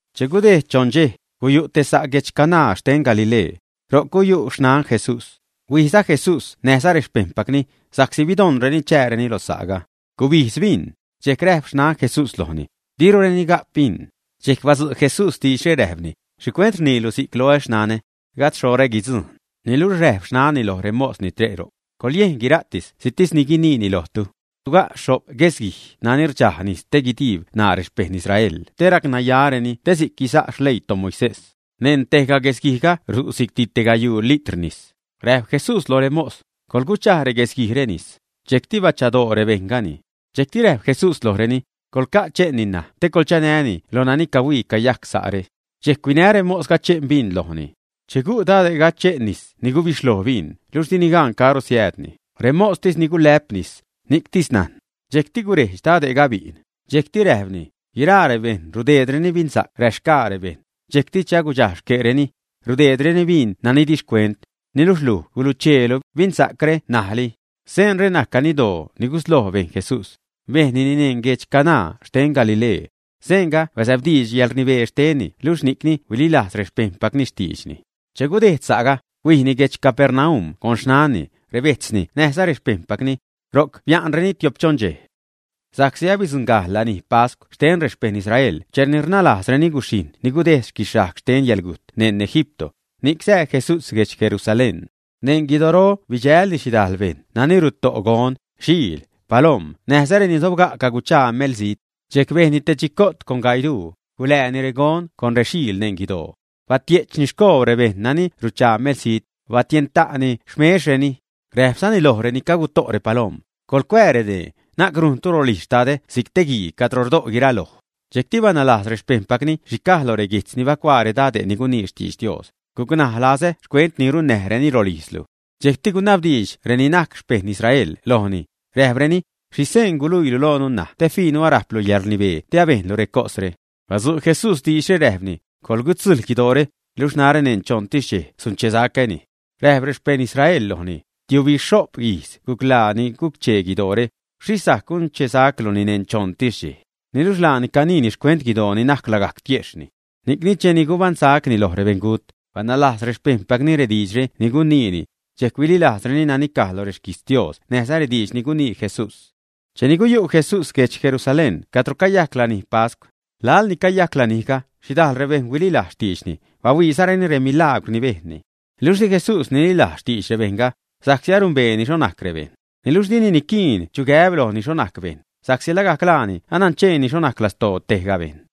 Che gudejd choṉ dxej, guyu' te sa' guedx Caná xten Galilee. Ro'c guyu' xnan Jesús. Huijza Jesús näjza rexpejṉpacni, sa'csi bidoṉreni chääreni lo sa'ga. Gubijdz bin. Dxejc räjp xnan Jesús lojni: ―Dirureni ga'p bin. Dxejc badzu' Jesús diidxre räjpni: ―¿Xhicuent rniilu si'c loä, xnanä? Gajd xhoṟä guidzujṉ. Niluxh räjp xnanni loj remos ni tre' ro'c: ―Coḻyejn guira'ti si'ctis ni guiniini lojtu. Suga' xho'p guesguij nani rdxaj nis te rdiib ṉaa rexpejṉ Israel te racnayareni te si'c guisa' xleii toMoisés. Neṉ tejga guesguijga ru' si'cti te gayuu litr nis. Räjp Jesús loj remos: ―Coḻguchaj reguesguijre nis. Dxejcti bachadoo rebejṉgani. Dxejcti räjp Jesús lojreni: ―Coḻca' che'nni ṉaj te coḻchanäni lo nani cahuii cayajc sa're. Dxejc huinä remosga che'n bin lojni. Che gu' dade'ga che'n nis ni gubixhloj bin (luxh dini gan caro siäädni, remostis ni gulä'p nis, ni'ctis najn). Dxejcti gurejdx dade'ga bi'n. Dxejcti räjpni: ―Guiraa rebejṉ rudeedreni binsa'c räxgaa rebejṉ, dxejcti che agudxaj xque'reni, rudeedreni bin nani di xcuent, niluxh luj gulucheelu binsa'cre ṉajli. Seenre najc ganiddoo ni gusloj bejn Jesús; bejnnini neṉ guedx Caná xten Galilee. Seenga bazäbdiidx yäḻrnibee xtenni luxh ni'cni huililajz rexpejṉpacni xtiidxni. Che gudejd sa'ga, huijni guedx Capernaum con xnanni, rebejtzni näjza rexpejṉpacni. Ro'c bia'nreni tio'p-choṉ dxej. Sa'csi abidzuṉgajxh lanij pascw xten rexpejṉ Israel cheni rnalajzreni guxhijṉ ni gudejd guixhajg xten yäḻgujt neṉ Egipto, ni'c sää Jesús guedx Jerusalén. Neṉ guidoro bidxälni xhidajl bejṉ nani ruto' gon, xiil, palom näjza reni sobga' caguchaa melzijt. Dxejc bejnni te chico't con gaii duu, gulääni regon con rexiil neṉ guidoo. Batie'chni xcoobr rebejṉ nani ruchaa melzijt, barexh-xhätni rexmexreni. Räjpzani loj reni caguto' repalom: ―Coḻcuää redee, na'c rujntu rolijz xtadä si'c te guii cadro rdo' guiraloj. Dxejcti banajlajz rexpejṉpacni xhi caj lo reguijtz ni bacuaa redade' ni gunii xtidx Dios: “Gucnaj lazä xcuent ni runnäjreni rolijzlu.” Dxejcti gunabdiidx reni najc xpejṉ Israel lojni, räjpreni: ―¿Xhi seen guluiilu loonu ṉaj te fiinu arajplu yäḻrnibee te abejnlu recosre? Badzu' Jesús diidxre räjpni: ―Coḻgutzujl guidoore, luxh narä neṉ choṉtis dxej sunchesacäni. Räjp rexpejṉ Israel lojni: ―Tiubixho'p ijz guclaa ni guc-chee guidoore, ¿xhixh sajc gunchesacluni neṉ choṉtis dxej, ä? Niluxh laani caniini xcuent guidoo ni najc lagajc tiejxhni. Ni'cni cheni gubaṉsacni loj rebeṉgut, banajlajz rexpejṉpacni rediidxre ni guniini, dxejc huililajzreni nani caj lo rexquijtz Dios näjza rediidx ni gunii Jesús. Cheni guyu' Jesús guedx Jerusalén cadro cayajc lanij pascw, laḻ ni cayajc lanijga, xhidajl rebejṉ huililajz xtiidxni, bahuiizareni remilagwr ni bejnni. Luxh di Jesús nililajz xtidx rebejṉga, sa'csi arumbeeni xho najc rebejṉ. Niluxh dini niquiin chu gäb lojni xho najc bejṉ, sa'csi lagajc laani anancheeni xho najc lastoo tejga bejṉ.